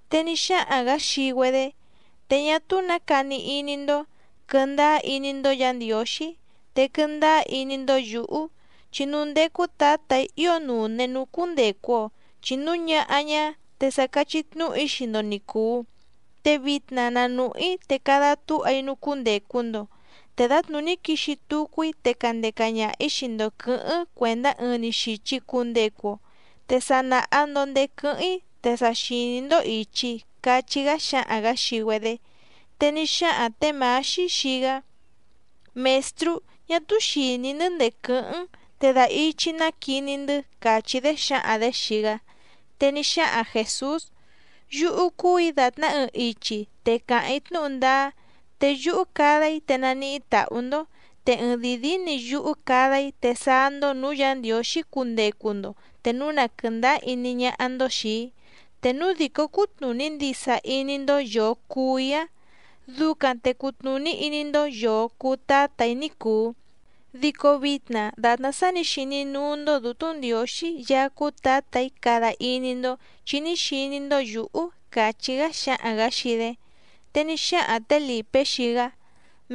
Te ní xáhaⁿ‑gǎ xii‑güedé: —Te ñá túú nǎ cani iní‑ndó. Quɨ̀ndáá iní‑ndó Yǎ Ndiǒxí, te quɨndáá iní‑ndó yǔhú. Chi núú ndécú Tǎtà‑í ío nùne núú cúndècu‑o, chi núu ñáhá ñá te sa cachí tnúhu‑í xii‑ndo ni cùu. Te vitna na nùhú‑í te cada túha‑í núú cúndècu‑ndo. Te dǎtnùní quixi tucu‑í te candeca ñaha‑ǐ xii‑ndo quɨ̌hɨ́ⁿ cuèndá ɨɨⁿ‑ni xìchi cundecu‑o. Te sa nàha‑ndo ndéé quɨ́hɨ́ⁿ‑í te sa xìní‑ndó ìchi —cachí‑gá xáhaⁿ‑gǎ xii‑güedé. Te ní xáhaⁿ tě Mǎxí xii‑gá: —Mèstrú, ñá túú xìní‑ndɨ́ ndèé quɨ́hɨ́ⁿ‑n te da ichi‑ná quiní‑ndɨ́ —càchí‑dé xǎhaⁿ‑dě xii‑gá. Te ní xáhaⁿ Jèsús: —Yúhú cúù‑í dàtná ɨɨⁿ ichi te càháⁿ‑í tnúhu ndáá, te yúhú cada‑í te naníhí tàhú‑ndó. Te ɨɨⁿ dìi díí‑ni yúhú cada‑í te sáá‑ndó nǔú Yǎ Ndiǒxí cundecu‑ndo te núu na quɨ̀ndáá iní ñáhá‑ndó xìi‑í. Te núu dìcó cútnùní ndisa iní‑ndó yòo cuu‑í‑áⁿ, ducaⁿ te cutnùní iní‑ndó yòo cuu Tátà‑í ní cùu. Dico vitna dàtná sá nǐ xiní núú‑ndó Dǔtú Ndiǒxí Yaá cúú Tǎtà‑í cada iní‑ndó, chi ní xiní‑ndó yǔhú —càchí‑gá xáhaⁿ‑gǎ xii‑dé. Te ní xáhaⁿ tě Lìpé xii‑gá: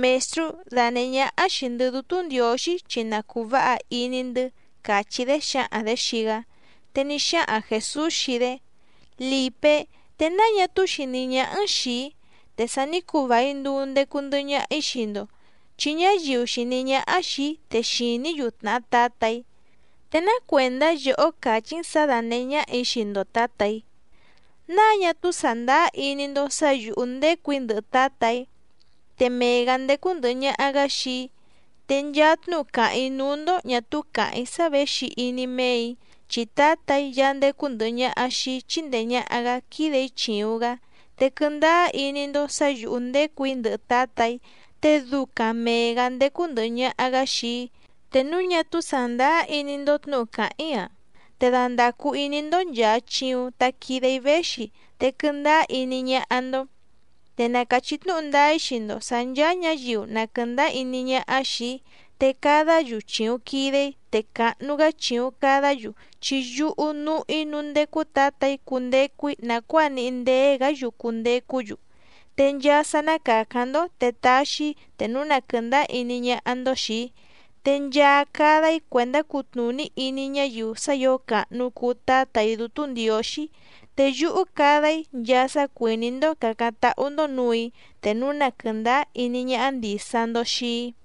—Mèstrú, danèhé ñáhá xìi‑ndɨ́ Dútú Ndiǒxí chi na cùu váha iní‑ndɨ́ —càchí‑dé xǎhaⁿ‑dě xii‑gá. Te ní xáhaⁿ Jèsús xii‑dé: —Lìpé, ¿te náa ñá túú xìní ñáhá‑n xìi‑í? Te sa ní cuu vài nduu ndecu ndɨhɨ ñaha‑í xii‑ndo, chi ñáyiu xìní ñáhá xìi‑í te xìní‑yu tnàhá Tǎtà‑í. ¿Te ná cuèndá yòhó càchí‑n sǎ dánèhé ñáhà‑í xii‑ndo Tǎtà‑í? ¿Náa ñá túú sàndáá iní‑ndó sǎ yǔhú ndécù‑í ndɨhɨ Tǎtà‑í? Te mee‑gǎ ndécú ndɨ̀hɨ ñaha‑gá xii‑í. Te nchaa tnúhu càháⁿ‑í núú‑ndó ñà túú càháⁿ‑í sá věxi iní méè‑í, chi Tǎtà‑í Yaá ndécú ndɨ̀hɨ ñaha xii‑í chíndèe ñaha‑gá quídè‑í chìuⁿ‑gá. Te quɨndáá iní‑ndó sǎ yǔhú ndécù‑í ndɨhɨ Tǎtà‑í, te ducaⁿ mèe‑gá ndécú ndɨ̀hɨ ñaha‑gá xii‑í. Te núu ñá túú sàndáá iní‑ndó tnǔhu càháⁿ‑í‑a, te dandàcu iní‑ndó nchàa chiuⁿ ta quide‑í véxi, te quɨndáá iní ñáhá‑ndó. Te na càchí tnúhu ndáá‑í xii‑ndo sǎ nchàa ñáyiu na quɨ̀ndáá iní ñáhá xìi‑í, te cadá‑yu chìuⁿ quide‑í te càhnu‑gá chìuⁿ cadá‑yu chi yúhú núhú‑í núú ndécú Tǎtà‑í cundecu‑í nàcuáa níhí ndéé‑gǎ‑yu cundecú‑yu. Te nchaa sá ná càcáⁿ‑ndó te taxi‑í te núu na quɨ̀ndáá iní ñáhá‑ndó xìi‑í, te nchaa cada‑í cuèndá cutnùní iní ñáyiu sá ǐo càhnu cuu Tátà‑í Dútú Ndiǒxí. Te yúhú cada‑í nchaa sá cuìní‑ndó càcáⁿ táhú‑ndó nǔù‑í, te núu na quɨ̀ndáá iní ñáhá ndìsa‑ndo xii‑í.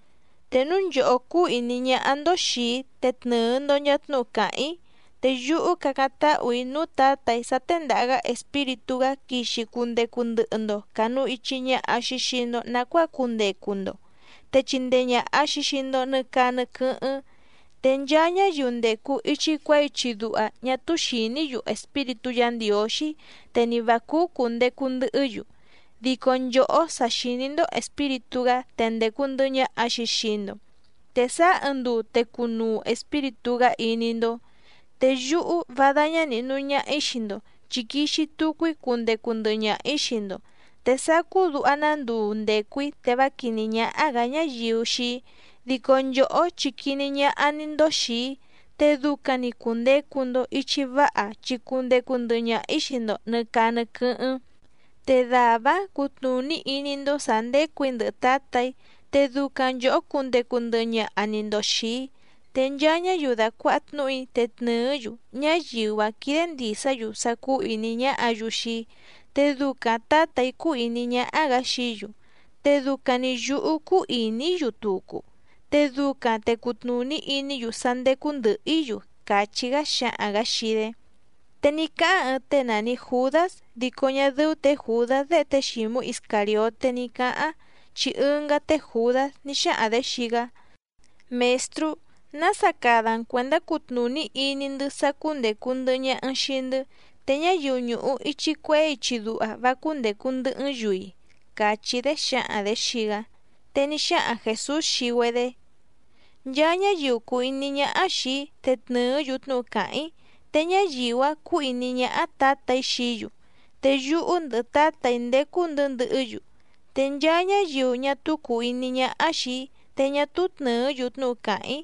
’Te núu nchòhó cúú ìní ñáhá‑ndó xìi‑í te tnɨɨ‑ndo nchàa tnúhu càháⁿ‑í. Te yúhú cacáⁿ táhù‑í núú Tǎtà‑í sá téndàha‑gá Espíritú‑gá quixi cundecu ndɨhɨ‑ndo cànu ichi ñaha‑xi xii‑ndo nacuáa cundecu‑ndo, te chindee ñàha‑xi xii‑ndo nɨ caa nɨ quɨ́hɨ́ⁿ. Te nchaa ñáyiu ndècu ichi cuehé ichi duha ñá túú xìní‑yu Espíritú Yǎ Ndiǒxí te ni vǎ cúú cùndecu ndɨhɨ́‑yu. Dico nchòhó sa xìní‑ndó Espíritú‑gá te ndècu ndɨhɨ ñaha‑xi xii‑ndo. Te sáá ɨɨⁿ nduu te cunuu Espíritú‑gá iní‑ndó. Te yúhú vá dáñá nìhnu ñaha‑í xii‑ndo, chi quixi tucu‑í cundecu ndɨhɨ ñaha‑ǐ xii‑ndo. Te sácú duha‑ná nduu ndècu‑í te vá quìní ñáhá‑gǎ ñáyiu xii‑í, dico nchòhó chi quiní ñáhá‑ní‑ndó xìi‑í. Te ducaⁿ‑ni cùndecu‑ndo ichi váha chi cundecu ndɨhɨ ñaha‑ǐ xii‑ndo nɨ̀ caa nɨ quɨ́hɨ́ⁿ. Te dàvá‑áⁿ cutnùní iní‑ndó sǎ ndécù‑í ndɨhɨ Tǎtà‑í, te ducaⁿ nchòhó cundecu ndɨhɨ ñaha‑ni‑ndo xìi‑í. Te nchaa ñáyiu dàcuaha tnúhu‑í te tnɨ̀ɨ́‑yu, ñáyiu‑áⁿ quídé ndìsá‑yu sá cúú ìní ñáhǎ‑yu xii‑í. Te ducaⁿ Tǎtà‑í cúú ìní ñáhá‑gǎ xií‑yu, te ducaⁿ‑ni yǔhú cúú ìní‑í‑yu tucu, te ducaⁿ te cùtnuní iní‑yu sá ndécú ndɨ̀hɨ‑í‑yu —càchí‑gá xáhaⁿ‑gǎ xii‑dé. Te ní cáháⁿ ɨɨⁿ tée nàni Judás dico ñá dɨ́ú tě Jùdás déhe té Xǐmú Iscàrioté ní cǎháⁿ, chi ɨngá té Jùdás ní xáhaⁿ‑dě xii‑gá: —Mèstrú, ¿nása cada‑n cuèndá cutnùní iní‑ndɨ́ sá cúndècu ndɨhɨ ñaha‑n xii‑ndɨ́, te ñáyiu ñùhu ichi cuehé ichi duha vá cúndècu ndɨhɨ́‑n‑yu‑i? —càchí‑dé xǎhaⁿ‑dě xii‑gá. Te ní xáhaⁿ Jèsús xii‑güedé: —Nchaa ñáyiu cùu iní ñáhá xìi‑í te tnɨ̀ɨ́‑yu tnúhu càháⁿ‑í, te ñáyiu‑áⁿ cúú ìní ñáhá Tǎtà‑í xií‑yu, te yúhú ndɨhɨ Tǎtà‑í ndécú‑ndɨ̌ ndɨhɨ́‑yu. Te nchaa ñáyiu ñá túú cùu iní ñáhá xìi‑í te ñá túú tnɨ̀ɨ́‑yu tnúhu càháⁿ‑í.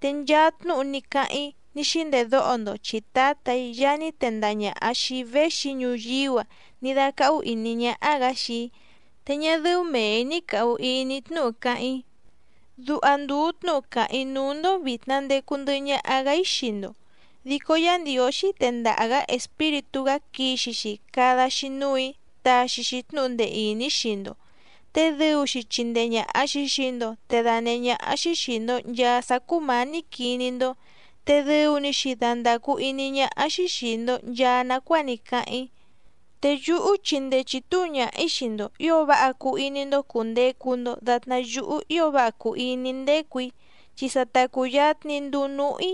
Te nchaa tnúhu ní cáháⁿ‑í ní xíndèdóho‑ndo chi Tǎtà‑í Yaá ní tendaha ñàha xii‑í véxi‑í ñuyíú‑a ní dácáhú ìní ñáhá‑gǎ xii‑í, te ñá dɨ́ú mèe‑í ní càhu iní‑í tnúhu cáháⁿ‑í. ’Duha ndùu tnúhu càháⁿ‑í núú‑ndó vìtna ndecu ndɨhɨ ñaha‑gá‑í xii‑ndo. Dico Yá Ndiǒxí tendaha‑gǎ Espíritú‑gá quixi‑xi cada‑xi núù‑í taxi‑xi tnúhu ndee ìní xii‑ndo, te dɨu‑xi chindee ñàha‑xi xii‑ndo te danèhé ñáhá‑xí xìi‑ndo nchaa sá cúmǎní quiní‑ndó, te dɨu‑ni‑xi dandàcu iní ñáhá‑xí xìi‑ndo nchaa nacuáa ní cáháⁿ‑í. ’Te yúhú chindee chìtuu ñaha‑í xii‑ndo ǐo váha cuu iní‑ndó cùndecu‑ndo datná yúhú ío váha cùu iní‑í ndécù‑í, chi sa ta cùyatni nduu núhú‑í.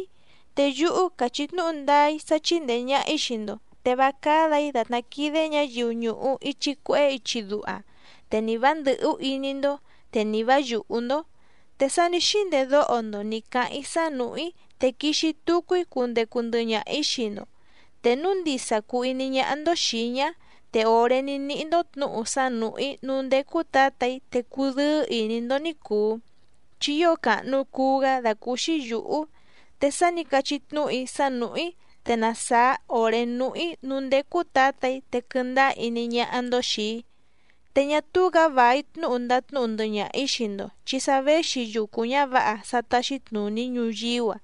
Te yúhú càchí tnúhu ndáá‑í sá chíndèe ñaha‑í xii‑ndo, te vá cádà‑í dàtná quídé ñǎyiu ñùhu ichi cuehé ichi duha. Te ni vǎ ndɨ̀hú iní‑ndó, te ni vǎ yùhú‑ndó. Te sa ní xíndèdóho‑ndo nǐ cáháⁿ‑í sá nùhú‑í, te quixi tucu‑í cundecu ndɨhɨ ñaha‑ǐ xii‑ndo. Te núu ndisa cùu iní ñáhá‑ndó xìi‑í ñá, te òré ní níhí‑ndó tnǔhu sá nùhú‑í núú ndécú Tǎtà‑í, te cudɨ́ɨ́ ìní‑ndó ní cùu, chi ío càhnu cuu‑gá dàcúúxí yǔhú. Te sa ní cachí tnúhu‑í sá nùhú‑í, te na sàá òré núhú‑í núú ndécú Tǎtà‑í, te quɨndáá iní ñáhá‑ndó xìi‑í. ’Te ñá túú‑gǎ vài tnúhu ndatnúhu ndɨhɨ ñaha‑ǐ xii‑ndo chi sa véxi yucu ñǎvǎha sá táxí tnùní ñuyíú‑a,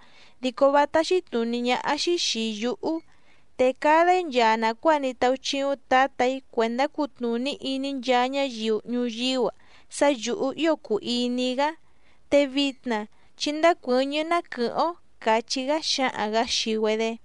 dico vá táxí tnùní ñáhá‑xí xìi yúhú. Te cada‑í nchaa nàcuáa ní táúchíúⁿ Tǎtà‑í cuèndá cutnùní iní nchaa ñáyiu ñuyíú‑a sá yǔhú ío cùu iní‑í‑gá. Te vitna chí ndácuɨ̌ñɨ́ ná quɨ̀hɨ́ⁿ‑ó —càchí‑gá xáhaⁿ‑gǎ xii‑güedé.